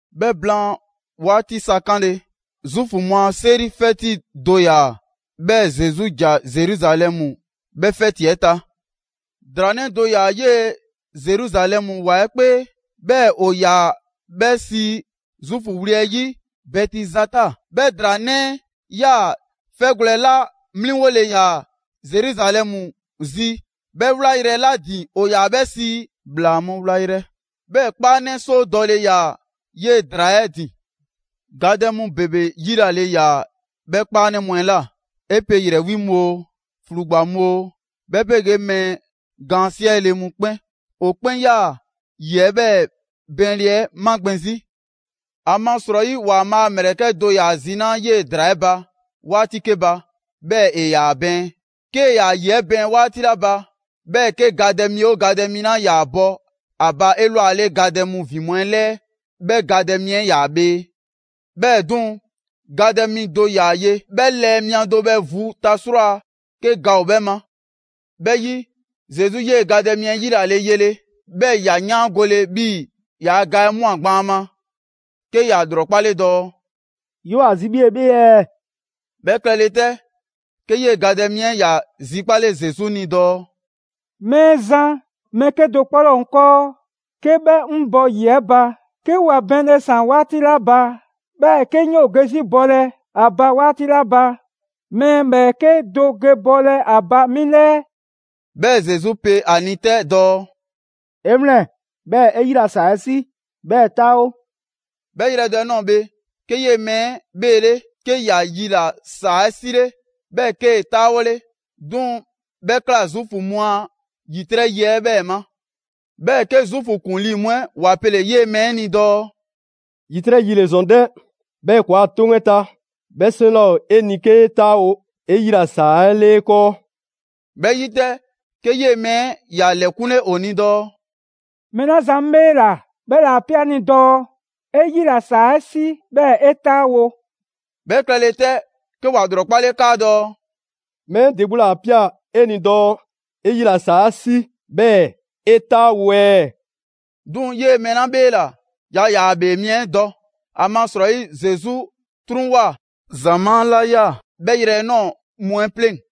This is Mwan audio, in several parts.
'Bhɛ blaan 'waati sa 'kanle‑, Zuufu mu a 'seri 'fɛti do ‑yaa, 'bhɛɛ‑ Zesu ‑ja Zeruzalɛmu 'bhɛ 'fɛti 'ɛ ta. ‑Draa 'nɛ do ‑yaa 'yee‑ Zeruzalɛmu ‑wa 'ɛ 'kpee, 'bhɛɛ‑ ‑o ‑yaa 'bhɛ sii Zuufu wli 'ɛ 'yi Bɛtizata. 'Bhɛ ‑draa 'nɛ 'ɛ yaa‑ 'fɛgwlɛ‑ 'la 'mliŋgole ‑yaa Zeruzalɛmu zi 'bhɛ 'wlayrɛ‑ 'la ‑din ‑o ‑yaa 'bhɛ sii ‹‑Bhlaa mu wlayrɛ›. 'Bhɛɛ‑ 'kpaanɛ 'soo dɔle ‑yaa 'yee‑ ‑draa 'ɛ ‑din. Gadɛ mu ‑bebe 'yilale ‑yaa 'bhɛ 'kpaanɛ mu 'ɛ ꞊la: 'e pe ‑yrɛ 'wi mu oo, ‑flugba mu oo, 'bhɛ 'pegee mɛɛ gaan 'siɛle‑ 'mu 'kpɛn. [‑O 'kpɛn 'yaa‑ ‑yi 'ɛ 'bhɛɛ‑ bɛɛnle 'ɛ magbɛn 'zi. ‑Amasrɔyi ‑Waanbhaa' a ‑mlɛkɛ' do ‑yaa zinaa' 'yee‑ ‑draa 'ɛ ba 'waati 'ke ba, 'bhɛɛ‑ ‑e ‑yaa bɛɛn. 'Kee‑ ‑yaa ‑yi 'ɛ bɛɛn 'waati 'la ba, 'bhɛɛ‑ 'ke gadɛ mi 'oo gadɛ mi 'la 'yaa‑ bɔ 'a ba 'elwale gadɛ mu ‑vin mu 'ɛ 'lɛɛ, 'bhɛ gadɛ mi 'ɛ 'yaa‑ bhee.] 'Bhɛɛ‑ 'duŋ‑, gadɛ mi do ‑yaa ye, 'bhɛ lɛɛ mia do bhɛ vu ta 'srwaa‑ 'ke ga ‑o 'bhɛ ma. 'Bhɛ 'yi, Zesu 'yee‑ gadɛ mi 'ɛ yilale yele, 'bhɛɛ‑ ‑ya 'yaangole 'bhii‑ ‑yaa' ga 'ɛ ꞊mwa gban ‑a ma, 'ke ‑ya ‑lrɔkpale dɔɔ: «'Yoo‑ ‑a zi 'bhii‑ 'e 'bhee ɛɛ?» 'Bhɛ klɛle 'tɛ, 'ke 'yee‑ gadɛ mi 'ɛ ‑ya zikpale Zesu ni dɔɔ: «Mɛɛzan, mɛɛ 'kedo‑ 'kpɔ 'laa ‑o 'ŋ 'kɔɔ, 'ke 'bhɛ 'ŋ bɔ ‑yi 'ɛ ba 'ke ‑wa bɛɛnle ‑saan 'waati 'la ba. 'Bhɛɛ‑ 'ke 'ŋ 'yoo‑ ge 'zi bɔlɛ ‑a ba 'waati 'la ba, mɛɛ ‑bhɛɛke' do ge bɔlɛ a ba 'mi 'lɛɛ.» 'Bhɛɛ‑ Zesu pe ‑a ni 'tɛ dɔɔ: «'E 'wlɛn‑, 'bhɛɛ‑ 'e 'yila‑ ‑saa 'ɛ 'si, 'bhɛɛ‑ 'taawo.» 'Bhɛ yrɛ do 'ɛ ꞊nɔɔ bhe, 'ke 'yee‑ mɛɛ 'ɛ 'bheele, 'ke ‑ya yila‑ ‑saa 'ɛ 'sile, 'bhɛɛ‑ 'kee‑ 'taawole. 'Duŋ‑ 'bhɛ ꞊kla Zuufu mu a ‑yitrɛ' yi 'ɛ 'bhɛɛ‑ ma. 'Bhɛɛ‑ 'ke Zuufu ‑kuŋlii mu 'ɛ ‑wa pele‑ 'yee‑ mɛɛ 'ɛ ni dɔɔ: «‑Yitrɛ' yi ‑le ‑zɔn 'dɛ! 'Bhɛɛ‑ ‑kɔɔa' 'toŋ 'ɛ ta, 'bhɛ 'seŋ 'laa ‑o 'e ni 'kee 'taawo‑ 'e 'yila‑ ‑saa 'ɛ 'le 'e 'kɔɔ.» 'Bhɛ 'yi 'tɛ, 'ke 'yee‑ mɛɛ 'ɛ ‑ya lɛkunle ‑o ni dɔɔ: «Mɛɛ 'la zan 'ŋ 'bheela‑ 'bhɛla‑ 'a ꞊pia 'ŋ ni dɔɔ: ‹'E 'yila‑ ‑saa 'ɛ 'si, 'bhɛɛ‑ 'e 'taawo›.» 'Bhɛ klɛle 'tɛ, 'ke ‑wa ‑lrɔkpale 'kaadɔɔ‑: «Mɛɛ 'ɛ ‑de 'gbu ‑le 'a ꞊pia 'e ni dɔɔ: ‹'E 'yila‑ ‑saa 'ɛ 'si, 'bhɛɛ‑ 'e 'taawo‑ ɛɛ?›» 'Duŋ‑ 'yee‑ mɛɛ 'la 'bheela‑, yaa ‑yaa ‑a ‑bhee mi 'ɛ dɔ. ‑Amasrɔyi Zesu 'truŋwoa꞊ ‑zamaa' 'la 'yaa‑ 'bhɛ yrɛ 'ɛ ꞊nɔɔ 'mu 'ɛ 'pleŋ‑.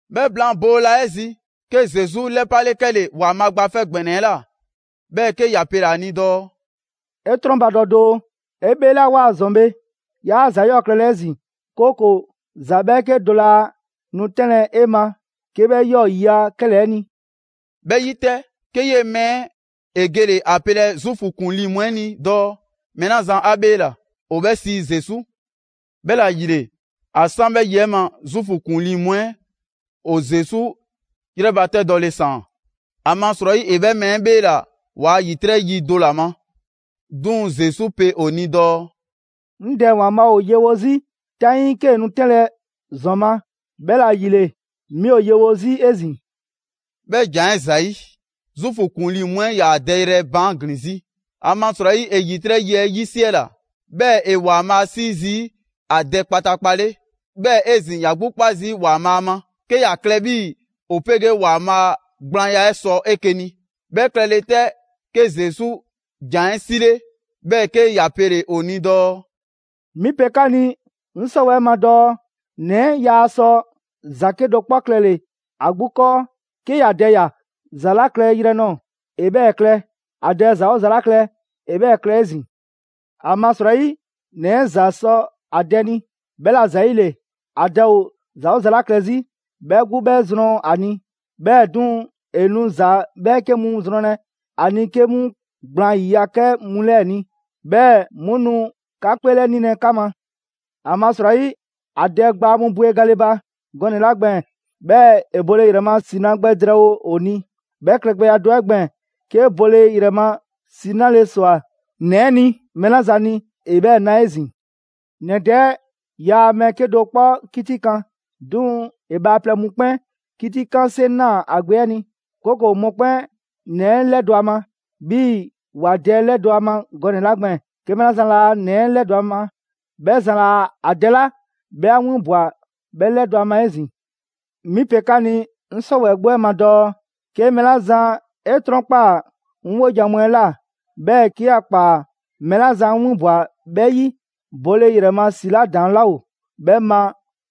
'Bhɛ blaan boola 'ɛ zi, 'ke Zesu 'lɛpale 'kɛle‑ ‑Waanbhaa' Gba 'Fɛ ‑Gbɛnɛ 'ɛ ꞊la, 'bhɛɛ‑ 'ke ‑ya pele‑ ‑a ni dɔɔ: «'E 'trɔnbadɔ doo, 'e 'bheelawoa ‑zɔn bhe, 'yaa ‑za 'yɔɔ‑ klɛlɛ 'ezin‑, 'kooko‑ ‑za 'bhɛɛke do laa nu 'tɛnlɛ‑ 'e ma 'ke 'bhɛ 'yɔɔ‑ ‑yiya' 'kɛlɛɛ‑ ni.» 'Bhɛ 'yi 'tɛ, 'ke 'yee‑ mɛɛ 'ɛ ‑e gele‑ ‑a pelɛ Zuufu ‑kuŋlii mu 'ɛ ni dɔɔ mɛɛ 'la zan 'a 'bheela‑ ‑o 'bhɛ sii Zesu. 'Bhɛla‑ ‑yile, ‑a 'san 'bhɛ yi 'ɛ ma, Zuufu ‑kuŋlii mu 'ɛ ‑o Zesu 'yrɛbatɛdɔle ‑saan, ‑amasrɔyi ‑e 'bhɛ mɛɛ 'ɛ 'bheela‑ ‑waa' ‑yitrɛ' yi do ‑la ma. 'Duŋ‑ Zesu pe ‑o ni dɔɔ: «'Ŋ Dɛ ‑Waanbhaa' ‑o yewo 'zi 'taŋii 'kee‑ nu 'tɛnlɛ‑ ‑zɔn ma, 'bhɛla‑ ‑yile 'mi ‑o yewo 'zi 'ezin‑.» 'Bhɛ ‑jan 'ɛ ‑zayi', Zuufu ‑kuŋlii mu 'ɛ 'yaa‑ dɛyrɛ baan' ‑glin 'zi, ‑amasrɔyi ‑e ‑yitrɛ' yi 'ɛ 'yisiɛla, 'bhɛɛ‑ ‑e ‑Waanbhaa' 'sii zii' ‑a Dɛ kpataakpa 'le. 'Bhɛɛ‑ 'ezin‑, ‑ya 'gbu 'kpa zii' ‑Waanbhaa' ma, 'ke ‑ya klɛ 'bhii‑ ‑o 'pegee ‑Waanbhaa' gblaanya 'ɛ sɔ 'eke‑ ni. 'Bhɛ klɛle 'tɛ, 'ke Zesu ‑jan 'ɛ 'sile‑, 'bhɛɛ‑ 'ke ‑ya pele‑ ‑o ni dɔɔ: «'Mi pe 'ka ni 'ŋ 'sɔwɛɛ‑ ma dɔɔ: ‑Nɛ 'ɛ yaa sɔ ‑za 'kedo‑ 'kpɔ klɛle‑ ‑a 'gbu 'kɔɔ. 'Ke ‑ya Dɛ ꞊ya ‑za 'la klɛyrɛ nɔɔ‑, ‑e 'bhɛɛ‑ klɛ. ‑A Dɛ ‑za 'oo ‑za 'la klɛ, ‑e 'bhɛɛ‑ klɛ 'ezin‑. ‑Amasrɔyi, ‑Nɛ 'ɛ ‑za sɔ ‑a Dɛ ni, 'bhɛla‑ ‑zayile, ‑a Dɛ ‑o ‑za 'oo ‑za 'la klɛ 'zi, 'bhɛ 'gbu 'bhɛ zrɔn ‑a ni. 'Bhɛɛ‑ 'duŋ‑, ‑e nu ‑za 'bhɛɛke mu zrɔnlɛ ‑a ni 'ke 'mu gblaan ‑yiya' 'kɛ mu 'lɛɛ‑ ni, 'bhɛɛ‑ 'mu nu 'ka 'kpeelɛnilɛ 'ka ma. ‑Amasrɔyi, ‑a Dɛ gbaa mu bwe gale ba gɔnɛ‑ 'la gbɛɛn‑, 'bhɛɛ‑ ‑e bole ‑yrɛ ma ‑si 'na gbɛ drɛɛwo ‑o ni, 'bhɛ klɛgbɛya do 'ɛ gbɛɛn‑, 'ke bole ‑yrɛ ‑si 'nale‑ ‑swa ‑Nɛ 'ɛ ni mɛɛ 'la zan ni, ‑e 'bhɛɛ‑ na 'ezin‑. ‑Nɛ Dɛ 'ɛ yaa mɛɛ 'kedo‑ 'kpɔ 'kitikan, 'duŋ‑ ‑e bhaaplɛŋ mu 'kpɛn 'kitikanle 'seŋ 'naa‑ ‑a Gbe 'ɛ ni, 'kooko‑ mɔkpɛn' ‑Nɛ 'ɛ 'lɛdɔ‑ ‑a ma 'bhii‑ ‑wa Dɛ 'ɛ ‑lɛdɔ' a ma gɔnɛ‑ 'la gbɛɛn‑. 'Ke mɛɛ 'la zan laa ‑Nɛ 'ɛ 'lɛdɔ‑ ‑a ma, 'bhɛ zan laa ‑a Dɛ 'la 'bhɛ 'a winbwa‑ 'bhɛ 'lɛdɔ‑ a ma 'ezin‑. «'Mi pe 'ka ni 'ŋ 'sɔwɛɛ‑ 'gbu 'ɛ ma dɔɔ: 'ke mɛɛ 'la zan 'e 'trɔnkpaa‑ 'ŋ 'wojan‑ mu 'ɛ ꞊la, 'bhɛɛ‑ 'ke ‑ya ‑kpaa mɛɛ 'la zan 'ŋ 'winbwa‑ 'bhɛ 'yi, bole ‑yrɛ ma ‑si 'la ‑daŋ' 'laa ‑o 'bhɛ ma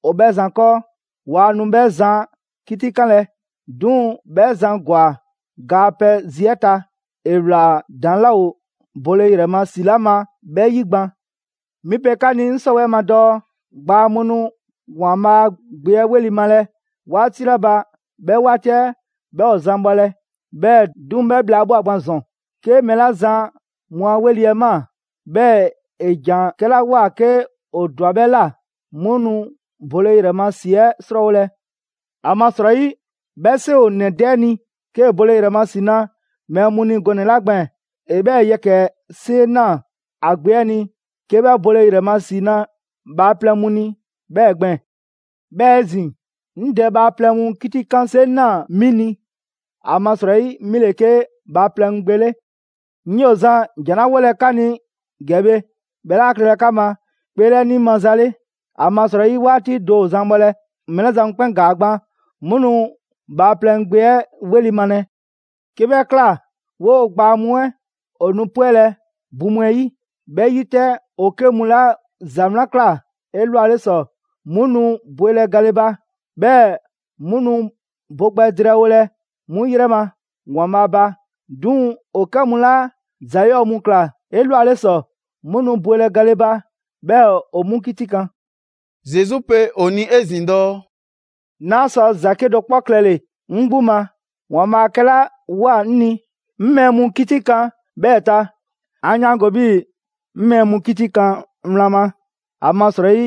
‑o 'bhɛ zan 'kɔɔ. Waa nu 'bhɛ zan 'kitikanlɛ, 'duŋ‑ 'bhɛ zan ‑gwa ga a pɛ zi 'ɛ ta, ‑e ꞊wlaa ‑daŋ' 'laa ‑o bole ‑yrɛ ma ‑si 'la ma 'bhɛ 'yi gban. 'Mi pe 'ka ni 'ŋ 'sɔwɛɛ‑ ma dɔɔ: Gbaa mu nu ‑Waanbhaa' Gbe 'ɛ 'weli‑ malɛ 'waati 'la ba 'bhɛ 'waati 'ɛ 'bhɛ ‑o zan bhɔlɛ, 'bhɛɛ‑ 'duŋ‑ 'bhɛ bhla 'ɛ ꞊bhwa gban ‑zɔn. 'Ke mɛɛ 'la zan mu 'a ‑weli' 'ɛ ꞊maa, 'bhɛɛ‑ ‑e ‑jan 'kɛla ꞊woa 'ke ‑o ꞊dwa 'bhɛ ꞊la, 'mu nu bole ‑yrɛ ma ‑si 'ɛ 'srɔɔwolɛ. ‑Amasrɔyi, 'bhɛ 'seŋ ‑o ‑nɛ Dɛ 'ɛ ni 'kee‑ bole ‑yrɛ ma ‑si na mɛɛ mu ni gɔnɛ‑ 'la gbɛɛn‑, ‑e 'bhɛɛ‑ yɛkɛ‑ 'seŋ 'naa‑ ‑a Gbe 'ɛ ni 'ke 'bhɛ bole ‑yrɛ ma ‑si na bhaaplɛŋ mu ni 'bhɛɛ‑ gbɛɛn‑. 'Bhɛɛ‑ 'ezin‑, 'ŋ Dɛ bhaaplɛŋ mu 'kitikan 'seŋ 'naa‑ 'mi ni, ‑amasrɔyi 'mi ‑le 'ke Bhaaplɛŋ Gbe 'ɛ 'le. 'Ŋ 'yoo‑ zan ‑jan 'la 'wolɛ‑ 'ka ni ‑gɛ bhe 'bhɛ 'laa klɛlɛ 'ka ma 'kpeelɛni maza 'le, ‑amasrɔyi 'waati do ‑o zan bhɔlɛ, mɛɛ 'la zan mu 'kpɛn ‑gaa gban, 'mu nu Bhaaplɛŋ Gbe 'ɛ 'weli‑ malɛ. 'Ke 'bhɛ ꞊kla, 'woo‑ gbaa mu 'ɛ ‑o nu 'pwɛlɛ‑ bu mu 'ɛ 'yi. 'Bhɛ 'yi 'tɛ, ‑o 'kɛ mu 'la ‑za 'wlan ꞊kla 'elwale ‑sɔ, 'mu nu ‑bwelɛ gale ba, 'bhɛɛ‑ 'mu nu bo gbɛ drɛɛwolɛ 'mu yrɛ ma ‑Waanbhaa' ba. 'Duŋ‑ ‑o 'kɛ mu 'la ‑za 'yɔɔ‑ mu ꞊kla 'elwale ‑sɔ, 'mu nu bwelɛ gale ba, 'bhɛɛ‑ ‑o 'mu 'kitikan.» Zesu pe ‑o ni 'ezin‑ dɔɔ: «'Naa sɔ ‑za 'kedo‑ 'kpɔ klɛle‑ 'ŋ 'gbu ma. ‑Waanbhaa' 'kɛla ꞊woa 'ŋ ni, 'ŋ mɛɛ mu 'kitikan 'bhɛɛ‑ ta. 'An 'yaango‑ 'bhii‑ 'ŋ mɛɛ mu 'kitikan wlan ma, ‑amasrɔyi,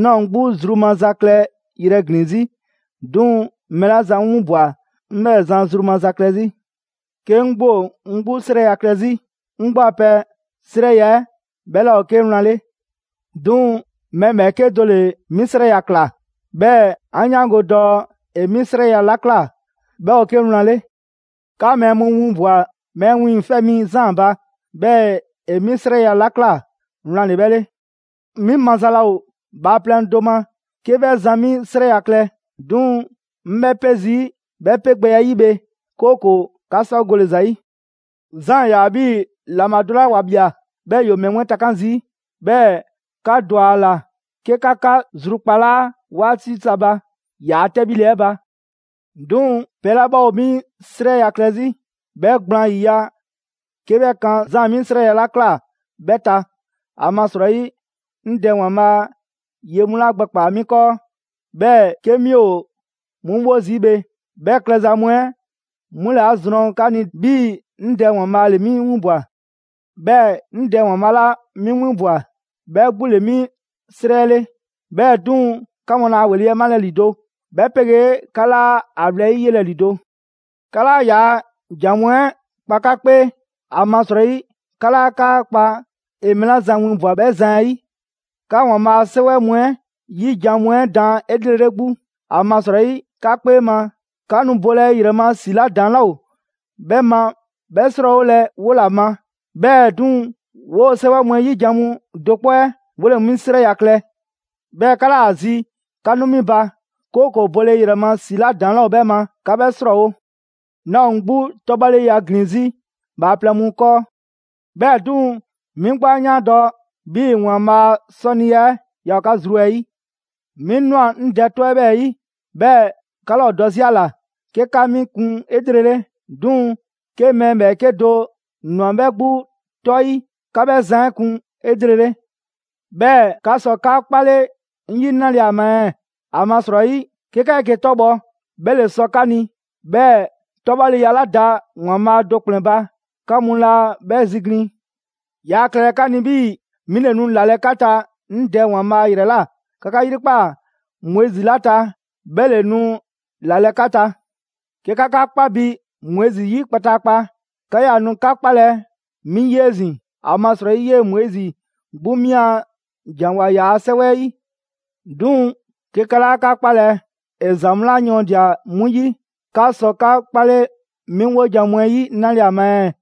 'naa ‑o 'ŋ 'gbu zru maza klɛ yrɛ ‑glin 'zi, 'duŋ‑ mɛɛ 'la zan 'ŋ 'winbwa‑ 'ŋ 'bhɛɛ‑ zan zru maza klɛ 'zi.» «'Ke 'ŋ 'gbu ‑o 'ŋ 'gbu 'srɛya‑ klɛ 'zi, 'ŋ 'gbu a pɛ 'srɛya‑ 'ɛ 'bhɛ 'laa ‑o 'ke wlan 'le. 'Duŋ‑ mɛɛ ‑bhɛɛke' do ‑le 'mi 'srɛya‑ ‑kla, 'bhɛɛ‑ 'an 'yaango‑ dɔɔ ‑e 'mi 'srɛya‑ 'la ꞊kla, 'bhɛ ‑o 'ke wlan 'le. 'Ka mɛɛ mu winbwa‑ Mɛɛ Wiiŋfɛ' Mi Zaan ba, 'bhɛɛ‑ ‑e 'mi 'srɛya‑ 'la ꞊kla, wlan ‑le 'bhɛ 'le. 'Mi maza laa ‑o bhaaplɛŋ do ma 'ke 'bhɛ zan 'mi 'srɛya‑ klɛ; 'duŋ‑ 'ŋ 'bhɛ 'pe zii' 'bhɛ 'pe gbɛya 'ɛ 'yi bhe, 'kooko‑ 'ka sɔ gole‑ ‑za 'yi. Zaan ‑yaa 'bhii‑ ‑laŋbha do 'la ‑wa ꞊bhia, 'bhɛɛ‑ ‑yoo mɛɛ mu 'ɛ takan' zii'. 'Bhɛɛ‑ 'ka ‑dwa ‑a ‑la 'ke 'ka 'ka zrukpalaa 'waati sa ba ‑yaa' 'tɛbhile 'ɛ ba. 'Duŋ‑ pɛ 'la 'bhɛ ‑o 'mi 'srɛya‑ klɛ 'zi, 'bhɛ gblaan ‑yiya' 'ke 'bhɛ 'kan Zaan 'mi 'srɛya‑ 'la ꞊kla 'bhɛ ta. ‑Amasrɔyi, 'ŋ Dɛ ‑Waanbhaa' ye mu 'la gbɛkpaa‑ 'mi 'kɔɔ, 'bhɛɛ‑ 'ke 'mi ‑o 'mu 'wo zii' bhe, 'bhɛ klɛza mu 'ɛ 'mu ‑le 'a zrɔn 'ka ni 'bhii‑ 'ŋ Dɛ ‑Waanbhaa' ‑le 'mi 'winbwa‑. 'Bhɛɛ‑ 'ŋ Dɛ ‑Waanbhaa' 'la 'mi 'winbwa‑ 'bhɛ 'gbu ‑le 'mi 'srɛ 'le. 'Bhɛɛ‑ 'duŋ‑ 'ka mu 'laa ‑a ‑weli' malɛ ‑lido', 'bhɛ 'pegee 'ka 'laa 'a wlɛyi' 'yelɛ‑ ‑lido'. 'Ka 'laa ‑yaa' ‑jan mu 'ɛ 'kpa 'ka 'kpee, ‑amasrɔyi 'ka 'laa 'ka kpa ‑e mɛɛ 'la zan winbwa‑ 'bhɛ zan 'ɛ 'yi. 'Ka ‑Waanbhaa' a 'Sɛwɛ mu 'ɛ 'yi jan mu 'ɛ daan 'elrele 'gbu, ‑amasrɔyi 'ka 'kpee ma, 'ka nu bole ‑yrɛ ma ‑si 'la ‑daŋ' 'laa ‑o 'bhɛ ma 'bhɛ 'srɔɔwolɛ 'wola‑ ma: 'bhɛɛ‑ 'duŋ‑, 'woo‑ 'sɛwɛ mu 'ɛ 'yi jan mu do 'kpɔ 'ɛ 'wole‑ 'mi 'srɛya‑ klɛ. 'Bhɛɛ‑ 'ka 'laa ‑a zi 'ka nu 'mi ba, 'kooko‑ 'bole ‑yrɛ ma ‑si 'la ‑daŋ' 'laa ‑o 'bhɛ ma 'ka 'bhɛ 'srɔɔwo‑.» «'Naa ‑o 'ŋ 'gbu 'tɔbhɔleya ‑glin 'zi bhaaplɛŋ mu 'kɔɔ. 'Bhɛɛ‑ 'duŋ‑, 'mi 'gbu 'a 'yaandɔ‑ 'bhii‑ ‑Waanbhaa' a 'sɔniya 'ɛ yaa ‑o 'ka zru 'ɛ 'yi. 'Mi ꞊nwa 'ŋ Dɛ 'tɔ 'ɛ 'bhɛɛ‑ 'yi, 'bhɛɛ‑ 'ka laa ‑o dɔ 'zi ‑a ‑la 'ke 'ka 'mi kun 'elrele. 'Duŋ‑, 'ke mɛɛ ‑bhɛɛke' do ꞊nwa 'bhɛ 'gbu 'tɔ 'yi, 'ka 'bhɛ zan 'ɛ kun 'elrele! 'Bhɛɛ‑ 'ka sɔ 'ka 'kpale 'ŋ 'yi 'nale‑ ‑a ma ɛɛ? ‑Amasrɔyi 'ke 'ka 'eke‑ 'tɔbhɔ‑, 'bhɛ ‑le sɔ 'ka ni, 'bhɛɛ‑ 'tɔbhɔleya 'la da ‑Waanbhaa' do ‑kplɛn ba, 'ka mu laa 'bhɛ ziglin. Yaa klɛlɛ 'ka ni 'bhii‑ 'mi ‑le nu ‑lalɛ' 'ka ta 'ŋ Dɛ ‑Waanbhaa' ‑yrɛ ꞊la. 'Ka 'ka 'yrikpaa‑ Moizi 'la ta, 'bhɛ ‑le nu ‑lalɛ' 'ka ta. 'Ke 'ka 'ka 'kpa bi Moizi 'yi kpataakpa, 'ka 'yaa‑ nu 'ka 'kpalɛ‑ 'mi 'yi 'ezin‑, ‑amasrɔyi 'yee‑ Moizi 'gbu 'mi a ‑janwoa ‑yaa' 'sɛwɛ 'ɛ 'yi. 'Duŋ‑ 'ke 'ka 'laa 'ka 'kpalɛ‑ ‑e ‑za mu 'la yɔɔndia‑ 'mu 'yi, 'ka sɔ 'ka 'kpale 'mi 'wojan‑ mu 'ɛ 'yi 'nale‑ ‑a ma ɛɛ?»